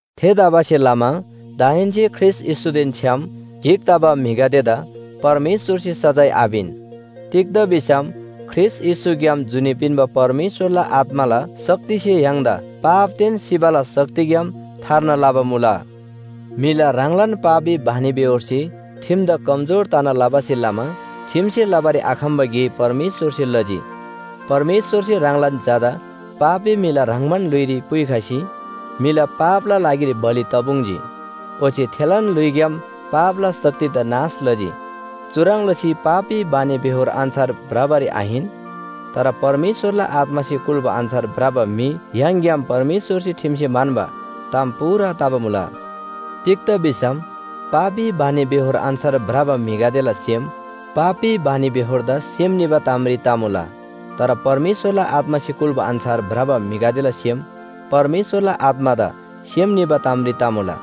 थेतबासेलमा दाहेन्‍से ख्रीष्‍ट येशूदेन छ्‌याम गिक तबा म्‍हिगदेदा परमेश्‍वरसे सजाय आपिन। तिग्‍दा भिसम ख्रीष्‍ट येशूग्‍याम जुनी पिन्‍बा परमेश्‍वरला आत्‍माला शक्तिसे य्‍हाङदा पापदेन सिबाला शक्तिग्‍याम थार्ना लबा मुला। म्‍हिला ह्राङलान पापी बानीबेहोरसे ठिमदा कमजोर तना लबासे लमा ठिमसे लबारी आखम्‍बा गे परमेश्‍वरसे लजी। परमेश्‍वरसे ह्राङलान झादा पापी म्‍हिला ह्रङ्‌बान ल्‍हुइरी पुइखसी म्‍हिला पापला लागिरी बलि तपुङ्जी। ओच्‍छे थेलान ल्‍हुइग्‍याम पापला शक्तिदा नाश लजी। चुह्रङ् लसी पापी बानीबेहोर अन्‍छार भ्रबारी आहिन, तर परमेश्‍वरला आत्‍मासे कुल्‍बा अन्‍छार भ्रबा म्‍हि य्‍हाङग्‍याम परमेश्‍वरसे ठिमसे म्‍हन्‍बा ताम पूरा तबा मुला। तिग्‍दा भिसम पापी बानीबेहोर अन्‍छार भ्रबा म्‍हिगदेला सेम पापी बानीबेहोरदा सेम निबा तामरी तमुला। तर परमेश्‍वरला आत्‍मासे कुल्‍बा अन्‍छार भ्रबा म्‍हिगदेला सेम परमेश्‍वरला आत्‍मादा सेम निबा तामरी तमुला।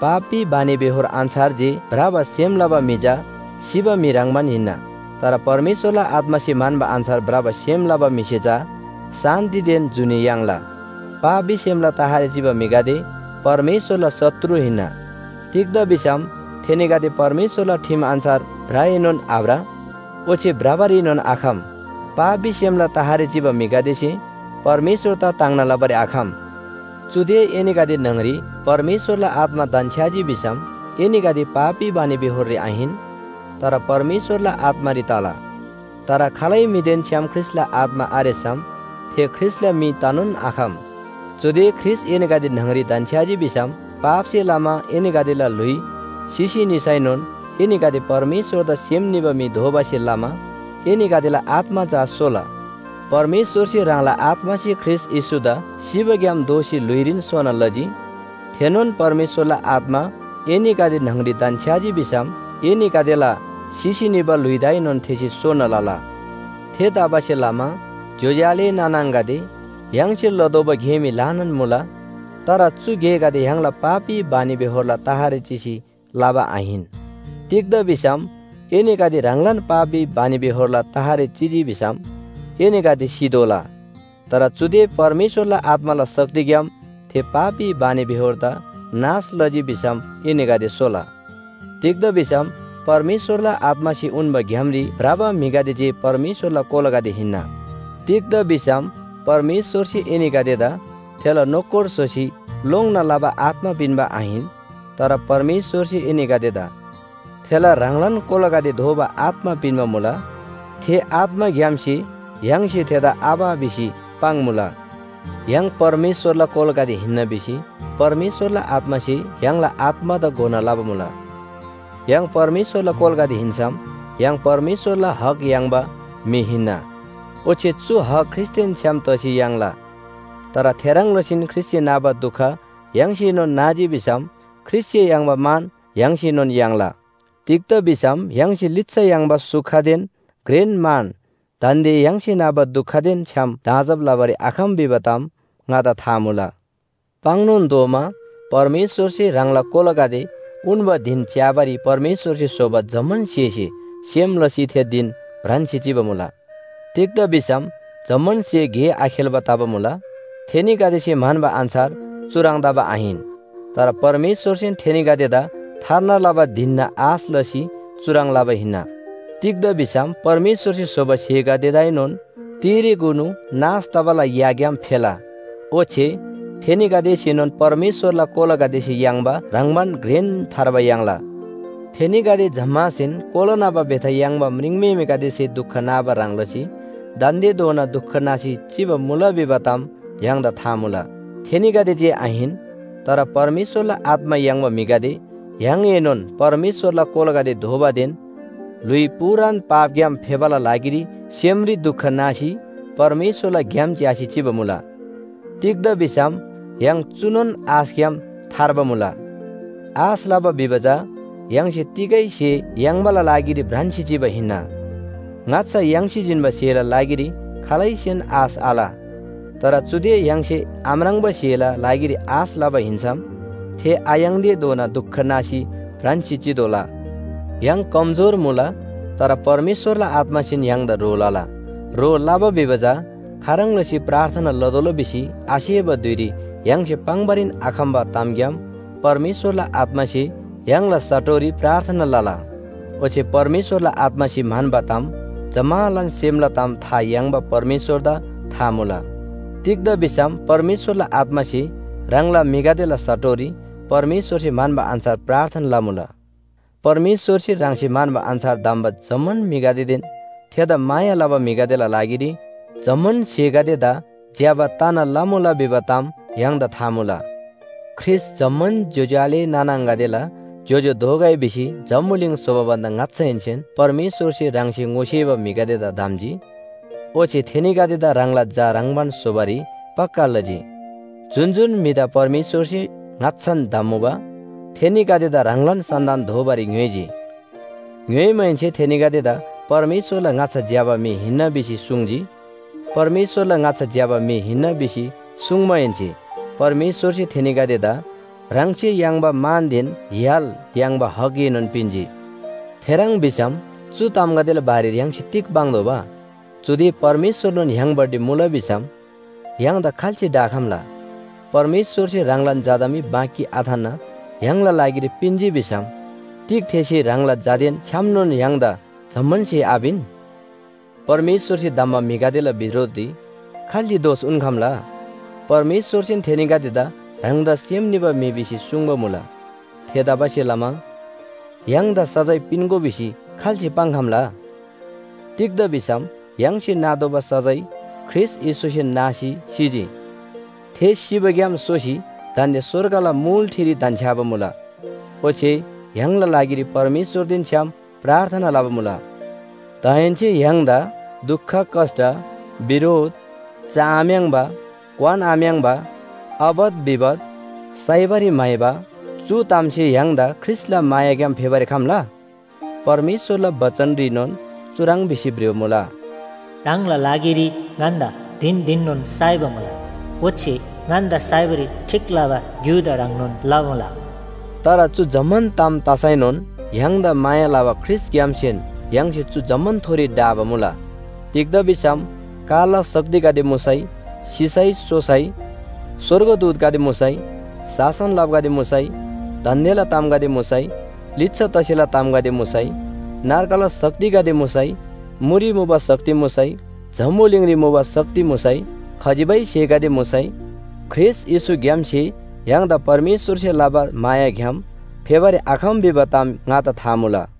पापी बानीबेहोर अन्‍छार जे भ्रबा सेम लबा म्‍हि चा सिबा म्‍हि ह्रङ्‌बान हिन्‍ना। तर परमेश्‍वरला आत्‍मासे म्‍हन्‍बा अन्‍छार भ्रबा सेम लबा म्‍हिसे चा शान्‍तिदेन जुनी याङ्ला। पापी सेमला तहरी चिबा म्‍हिगदे परमेश्‍वरला शत्रु हिन्‍ना। तिग्‍दा भिसम थेनीगदे परमेश्‍वरला ठिम अन्‍छार भ्रएनोन आभ्र ओच्‍छे भ्रबारीएनोन आखम। पापी सेमला तहरी चिबा म्‍हिगदेसे परमेश्‍वरदा ताङ्ना लबारी आखम। चुदे एनीगदे न्‍हङरी परमेश्‍वरला आत्‍मा धन्‍छ्‌याजी भिसम एनीगदे पापी बानीबेहोररी आहिन, तर परमेश्‍वरला आत्‍मारी तला। तर खालै म्‍हिदेन छ्‌याम ख्रीष्‍टला आत्‍मा आरेसम थे ख्रीष्‍टला म्‍हि तनोन आखम। चुदे ख्रीष्‍ट एनीगदे न्‍हङरी धन्‍छ्‌याजी भिसम पापसे लमा एनीगदेला ल्‍हुइ सिसी निसैनोन एनीगदे परमेश्‍वरदा सेम निबा म्‍हि दोबासे लमा एनीगदेला आत्‍मा चा सोला। परमेश्‍वरसे ह्राङला आत्‍मासे ख्रीष्‍ट येशूदा सिबाग्‍याम दोःसी ल्‍हुइरीन सोना लजी। थेनोन परमेश्‍वरला आत्‍मा एनीगदे न्‍हङरी धन्‍छ्‌याजी भिसम एनीगदेला सिसी निबा ल्‍हुइदाएनोन थेसे सोना लला। थेतबासेलमा ज्‍योज्‍यो आले नाना आङागदे, य्‍हाङसे लतोःबा गे मी ल्‍हानान मुला, तर चु गेगदे य्‍हाङला पापी बानीबेहोरला तहरी चिसी लबा आहिन। तिग्‍दा भिसम एनीगदे ह्राङलान पापी बानीबेहोरला तहरी चिजी भिसम एनीगदे सितोःला। तर चुदे परमेश्‍वरला आत्‍माला शक्तिग्‍याम थे पापी बानीबेहोरदा नाश लजी भिसम एनीगदे सोला। तिग्‍दा भिसम परमेश्‍वरला आत्‍मासे उन्‍बा ग्‍यामरी भ्रबा म्‍हिगदे जे परमेश्‍वरला कोलागदे हिन्‍ना। तिग्‍दा भिसम परमेश्‍वरसे एनीगदेदा थेला नोकर स्‍होसी लोङ्‌ना लबा आत्‍मा पिन्‍बा आहिन, तर परमेश्‍वरसे एनीगदेदा थेला ह्राङलान कोलागदे दोबा आत्‍मा पिन्‍बा मुला। थे आत्‍माग्‍यामसे य्‍हाङसे थेदा “आबा” भिसी पाङ्‌मुला। य्‍हाङ परमेश्‍वरला कोलागदे हिन्‍ना भिसी परमेश्‍वरला आत्‍मासे य्‍हाङला आत्‍मादा घोना लबा मुला। य्‍हाङ परमेश्‍वरला कोलागदे हिन्‍सम य्‍हाङ परमेश्‍वरला हक याङ्बा म्‍हि हिन्‍ना। ओच्‍छे चु हक ख्रीष्‍टदेन छ्‌याम तसी याङ्ला। तर थेह्रङ् लसीन ख्रीष्‍टसे नाबा दुख य्‍हाङसेनोन नाजी भिसम ख्रीष्‍टसे याङ्बा मान य्‍हाङसेनोन याङ्ला। तिग्‍दा भिसम य्‍हाङसे लिच्‍छा याङ्बा सुखदेन घ्रेन मान दान्‍दे य्‍हाङसे नाबा दुखदेन छ्‌याम दाँजब लबारी आखम भिबा ताम ङादा था मुला। पाङ्‌नोन तोःमा, परमेश्‍वरसे ह्राङला कोलागदे उन्‍बा धिन च्‍याबारी परमेश्‍वरसे स्‍होबा जम्‍मान स्‍हेसे सेम लसी थे धिन भ्रान्‍सी चिबा मुला। तिग्‍दा भिसम जम्‍मान स्‍हे गे आखेल्‍बा तबा मुला, थेनीगदेसे म्‍हन्‍बा अन्‍छार चुह्रङ् तबा आहिन। तर परमेश्‍वरसेन थेनीगदेदा थार्ना लबा धिनना आश लसी चुह्रङ् लबा हिन्‍ना। तिग्‍दा भिसम परमेश्‍वरसे स्‍होबा स्‍हेगदेदाएनोन तिरेकुनु नाश तबाला याग्‍याम फेला, ओच्‍छे थेनीगदेसेनोन परमेश्‍वरला कोलागदेसे याङ्बा ह्रङ्‌बान घ्रेन थार्बा याङ्ला। थेनीगदे जम्‍मासेन कोला न्‍हबा बेथा याङ्बा म्रिङम्‍हेमेगदेसे दुख नाबा ह्रङ् लसी दान्‍देधोना दुख नासी चिबा मुला भिबा ताम य्‍हाङदा था मुला। थेनीगदे जे आहिन, तर परमेश्‍वरला आत्‍मा याङ्बा म्‍हिगदे य्‍हाङएनोन परमेश्‍वरला कोलागदे दोबादेन ल्‍हुइ पूरान पापग्‍याम फेबाला लागिरी सेमरी दुख नासी परमेश्‍वरला ग्‍याम च्‍यासी चिबा मुला। तिग्‍दा भिसम य्‍हाङ चुनोन आशग्‍याम थार्बा मुला। आश लबा भिबा चा य्‍हाङसे तिगै स्‍हे याङ्बाला लागिरी भ्रान्‍सी चिबा हिन्‍ना। ङाच्‍छा याङ्सी जिन्‍बा स्‍हेला लागिरी खालैसेन आश आल। तर चुदे य्‍हाङसे आम्राङ्बा स्‍हेला लागिरी आश लबा हिन्‍सम थे आयाङ्‌तेधोना दुख नासी भ्रान्‍सी चितोःला। य्‍हाङ कमजोर मुला, तर परमेश्‍वरला आत्‍मासेन य्‍हाङदा ह्रो लला। ह्रो लबा भिबा चा खाह्रङ् लसी प्रार्थना लतोःला भिसी आसेबा धुइरी य्‍हाङसे पाङ्‌बारीन आखम्‍बा तामग्‍याम परमेश्‍वरला आत्‍मासे य्‍हाङला साटोरी प्रार्थना लला। ओच्‍छे परमेश्‍वरला आत्‍मासे म्‍हन्‍बा ताम जम्‍मालान सेमला ताम था याङ्बा परमेश्‍वरदा था मुला। तिग्‍दा भिसम परमेश्‍वरला आत्‍मासे ह्राङला म्‍हिगदेला साटोरी परमेश्‍वरसे म्‍हन्‍बा अन्‍छार प्रार्थना लमुला। परमेश्‍वरसे ह्राङसे म्‍हन्‍बा अन्‍छार धम्‍बा जम्‍मान म्‍हिगदेदेन थेदा माया लबा म्‍हिगदेला लागिरी जम्‍मान स्‍हेगदेदा ज्‍यबा तना लमुला भिबा ताम य्‍हाङदा था मुला। ख्रीष्‍ट जम्‍मान ज्‍योज्‍यो आले नाना आङागदेला ज्‍योज्‍यो दोगै भिसी जम्‍बुलिङ स्‍होबा भन्‍दा ङाच्‍छाहेन्‍सेन परमेश्‍वरसे ह्राङसे ङोसेबा म्‍हिगदेदा धम्‍जी। ओच्‍छे थेनीगदेदा ह्राङला झा ह्रङ्‌बान स्‍होबारी पक्‍का लजी। जुन जुन म्‍हिदा परमेश्‍वरसे ङाच्‍छान धम्‍मुबा, थेनीगदेदा ह्राङलान सन्‍तान दोबारी ङ्‌योइजी। ङ्‍योइमाहेन्‍से थेनीगदेदा परमेश्‍वरला ङाच्‍छा ज्‍यबा म्‍हि हिन्‍ना भिसी सुङ्जी। परमेश्‍वरला ङाच्‍छा ज्‍यबा म्‍हि हिन्‍ना भिसी सुङ्माहेन्‍से परमेश्‍वरसे थेनीगदेदा ह्राङसे याङ्बा मानदेन य्‍हाल याङ्बा हकएनोन पिन्‍जी। थेह्रङ् भिसम चु तामगदेला बारेरी य्‍हाङसे तिग पाङ्तोःबा? चुदे परमेश्‍वरनोन य्‍हाङपट्टि मुला भिसम य्‍हाङदा खाल्‍से ढाखम्‍ला? परमेश्‍वरसे ह्राङलान झादा मी बाँकी आथान्‍ना य्‍हाङला लागिरी पिन्‍जी भिसम तिग थेसे ह्राङला झादेन छ्‌यामनोन य्‍हाङदा जम्‍मान स्‍हे आपिन? परमेश्‍वरसे धम्‍बा म्‍हिगदेला बिरोधरी खाल्‍से दोष उन्‍खम्‍ला? परमेश्‍वरसेन थेनीगदेदा ह्राङदा सेम निबा म्‍हि भिसी सुङ्बा मुला। थेतबासेलमा य्‍हाङदा सजाय पिन्‍गो भिसी खाल्‍से पाङ्‌खम्‍ला? तिग्‍दा भिसम य्‍हाङसे नातोःबा सजाय ख्रीष्‍ट येशूसेन नासी सिजी। थे सिबाग्‍याम सोसी दान्‍दे स्‍वर्गला मुल ठिरी धन्‍छ्‌याबा मुला। ओच्‍छे य्‍हाङला लागिरी परमेश्‍वरदेन छ्‌याम प्रार्थना लबा मुला। दाहेन्‍से य्‍हाङदा दुख कष्‍ट, बिरोध, चआम्‍याङ्बा, क्‍वानआम्‍याङ्बा, आपत विपत, साइबारी म्‍हाइबा चु तामसे य्‍हाङदा ख्रीष्‍टला मायाग्‍याम फेबारी खम्‍ला? परमेश्‍वरला बचनरीनोन चुह्रङ् भिसी भ्रिबा मुला, “ह्राङला लागिरी ङन्‍दा धिन धिननोन साइबा मुला, ओच्‍छे ङन्‍दा साइबारी ठीक लबा ग्‍युदा ह्रङ्नोन लमुला।” तर चु जम्‍मान ताम तसैनोन य्‍हाङदा माया लबा ख्रीष्‍टग्‍यामसेन य्‍हाङसे चु जम्‍मानथोरी ढाबा मुला। तिग्‍दा भिसम कालला शक्तिगदे मुसै, सिसै, सोसै, स्‍वर्गदूतगदे मुसै, शासन लबागदे मुसै, दान्‍देला तामगदे मुसै, लिच्‍छा तसेला तामगदे मुसै, नर्गला शक्तिगदे मुसै, मुरी मुबा शक्ति मुसै, जम्‍बुलिङरी मुबा शक्ति मुसै, खजिबै स्‍हेगदे मुसै ख्रीष्‍ट येशूग्‍यामसे य्‍हाङदा परमेश्‍वरसे लबा मायाग्‍याम फेबारी आखम भिबा ताम ङादा था मुला।